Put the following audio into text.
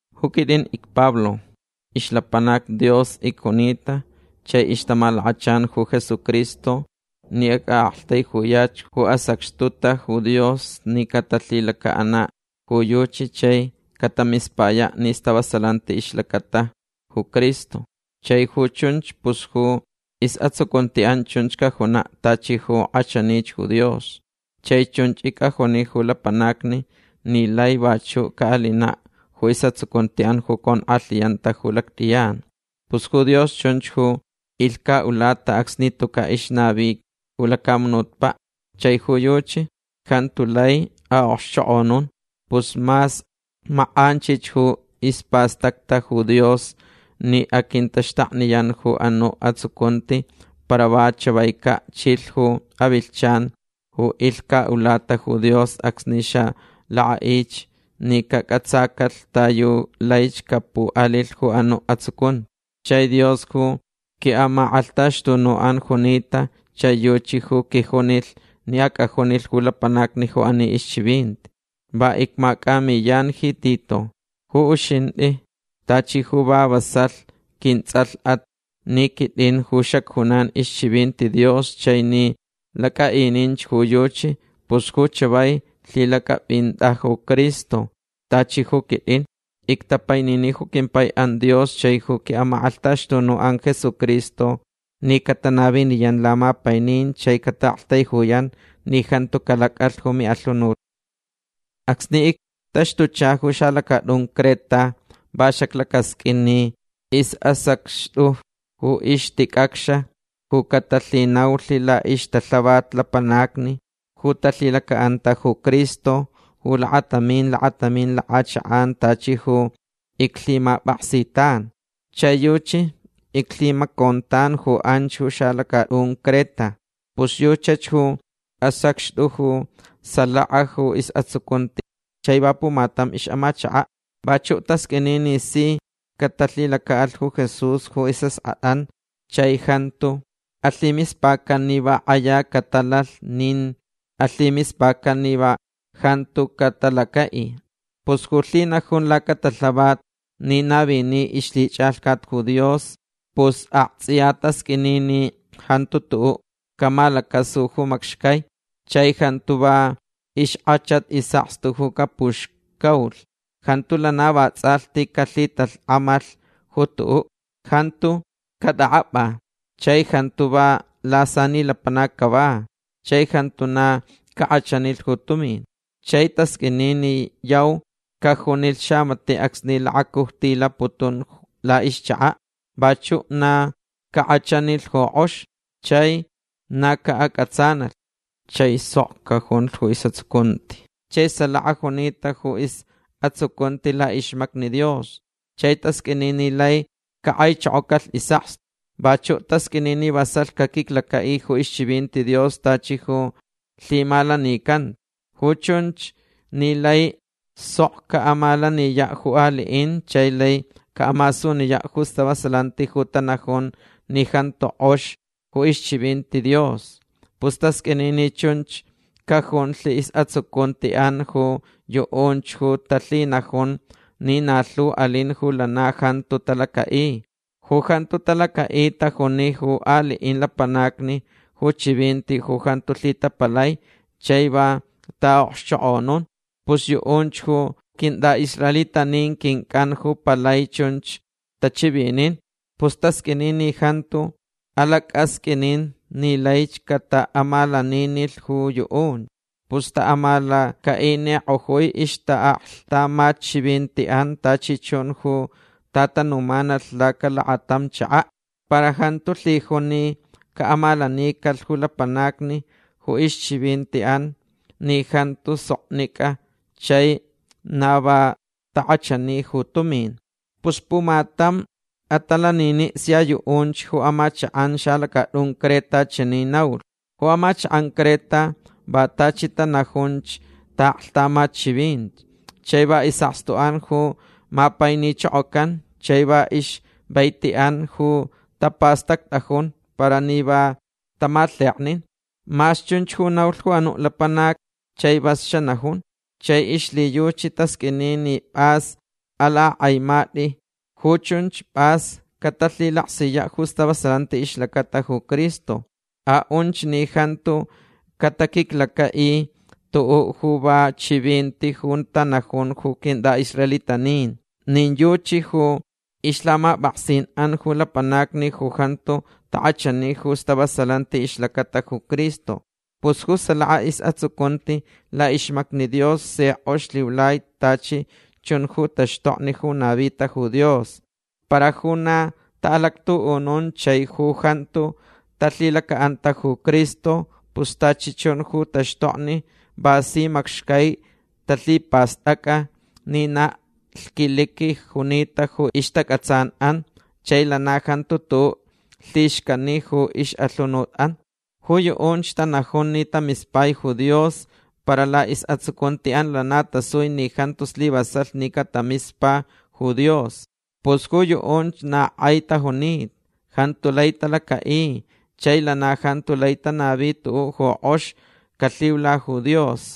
Ju quitʼin icPablo. Ixlapanac Dios icjunita chai ixtamalakachan ju Jesucristo ni acʼaʼaktaijuyach ju asacxtuta ju Dios ni catalhilacaʼanach ju yuchi chai catamispayach ju stavasalanti ixlacata ju Cristo. Chai ju chunch pus ju isʼatsucuntiʼan chunch cajunaʼ tachi ju kʼachanich ju Dios. Chai chunch icʼajuni ju lapanacni ni laich vachuʼ caʼalinaʼ ju isʼatsucuntiʼan ju conkʼalhiyanta ju lactʼiyan. Pus ju Dios chunch ju ilhcaʼulata acsni tucaʼ ixnavi ju lacamunutpaʼ. Chai ju yuchi jantu lai aʼokxchokʼonun. Pus mas makʼanchich ju ispastacta ju Dios ni aquintaxtakniyan ju anuʼ atsucunti para va chavaicaʼ chilh ju avilhchan ju ilhcaʼulata ju Dios acsni xalakʼaʼich ni cacʼatsacalh ta yu laich capuʼalilh ju anuʼ atsucunti. Chai Dios ju quiʼamakʼalhtaxtunuʼan junita chai yuchi ju quijunilh ni acʼajunilh ju lapanacni ju ani ixchivinti. Va icmacʼamiyan ji Tito. Ju uxintʼi tachi ju va vasalh quintsʼalhʼat ni quitʼin ju xacjunan ixchivinti Dios chai ni lacʼaʼinich ju yuchi pus ju chavai lhilacʼapʼintʼa ju Cristo tachi ju quitʼin. Ictapainini ju quimpaiʼan Dios chai ju quiʼamakʼalhtaxtunuʼan Jesucristo ni catanaviniyan lamapainin chai cataʼaktaijuyan ni jantu calacʼalh ju miʼalhunut. Acsni ictaxtucha ju xalacatʼun Creta va xaclacasqʼuin ni isʼasacxtʼu ju ixticʼacx ju catalhinaulh laʼixtalhavat lapanacni ju talhilacaʼanta ju Cristo ju lakatamin lakatamin lakʼachakʼan tachi ju iclhimapʼaksitanch. Chai yuchi iclhimacontan ju anch ju xalacatʼun Creta. Pus yuchach ju asacxtʼu ju salaka ju isʼatsucunti chai va pumatam ixʼamachakaʼ. Vachuʼ tasqʼuini ni si catalhilacaʼalh ju Jesús ju isʼaskʼatʼan chai jantu alhimispacan ni va kʼaya catalalh nin alhimispacan ni va jantu catalacaʼi. Pus ju lhinajun lacatalhavat ni navini ixlhichʼalhcat ju Dios pus aktsʼiya tasqʼuini ni jantu tuʼuʼ camalacasu ju macxcai. Chai jantu va ixkʼachat isʼakstu ju capuxcaulh. Jantu lana vatsʼalhti calhitalhkʼamalh ju tuʼuʼ. Jantu catʼakʼapʼa. Chai jantu va lasani lapanac cava. Chai jantu na cakʼachanilh ju tumin. Chai tasqʼuini ni yau cajunilh xamatiʼ acsni lakacujtilaputun laʼixchakaʼ. Vachuʼ na cakʼachanilh ju kʼox. Chai na caʼacʼatsanalh. Chai sok cajunlh ju isʼatsucunti. Chai salaka junita ju isʼatsucunti laʼixmacni Dios. Chai tasqʼuini ni lai cakʼaichokocalh isʼakstu. Vachuʼ tasqʼuini ni vasalh caquiclacaʼi ju ixchivinti Dios tachi ju lhimalanicanta. Ju chunch ni lai sok caʼamalaniyaʼ ju aliʼin chai lai caʼamasuniyaʼ ju stavasalanti ju tanajun ni jantu kʼox ju ixchivinti Dios. Pus tasqʼuini ni chunch cajunlh isʼatsucuntiʼan ju yuʼunch ju talhinajun ni na lhu alin ju lana jantu talacaʼi. Ju jantu talacaʼi tajuni ju aliʼin lapanacni ju chivinti ju jantu lhitapalai chai va taʼaʼokxchokʼonun. Pus yuʼunch ju quintʼaʼisraelitanin quincʼan ju palai chunch tachivinin. Pus tasqʼuini ni jantuch alacʼasqʼuinin ni laich cataʼamalaninilh ju yuʼunch. Pus taʼamalacaʼinikʼojui ixtaʼaklhtamatchivintiʼan tachi chun ju tatanumanalh lacalakatamin chakaʼ. Para jantu lhijun ni caʼamalanicalh ju lapanacni ju ixchivintiʼan ni jantu soknicʼa chai na va takʼachani ju tumin. Pus pumatam atalaniniʼ sia yuʼunch ju amachakʼan xalacatʼun Creta chani naulh: “Ju amachakʼan Creta va tachi tanajunch taʼaklhtamat chivinti. Chai va isʼakstuʼan ju mapainichokocan chai va ixvaitiʼan ju tapastactʼajun para ni va tamalheknin”. Ma chunch ju naulh ju anuʼ lapanac. Chai vas xanajun. Chai ixlhiyuchi tasqʼuini ni pʼas alakʼakʼaimatʼi. Ju chunch pʼas catalhilaksiyaʼ ju stavasalanti ixlacata ju Cristo. Aʼunch ni jantuch cataquiclacaʼilh tuʼuʼ ju va chivintich ju tanajun ju quintʼaʼisraelitanin. Nin yuchi ju ixlhamapʼaksinʼan ju lapanacni ju jantu takʼachani ju stavasalanti ixlacata ju Cristo. Pus ju salaka isʼatsucunti laʼixmacni Dios si kʼox lhiulai tachi chun ju taxtokni ju navita ju Dios. Para ju na taʼalactuʼunun chai ju jantu talhilacaʼanta ju Cristo pus tachi chun ju taxtokni va si macxcai talhipastʼacʼa ni na lhquiliqui junita ju ixtacʼatsanʼan chai lana jantu tuʼuʼ lhixcani ju ixʼalhunutʼan. Ju yuʼunch tanajun ni tamispai ju Dios para laʼisʼatsucuntiʼan lana tasui ni jantu slivasalh ni catamispa ju Dios. Pus ju yuʼunch na kʼai tajunita. Jantu lai talacaʼi chai lana jantu lai tanavi tuʼuʼ ju kʼox calhiula ju Dios.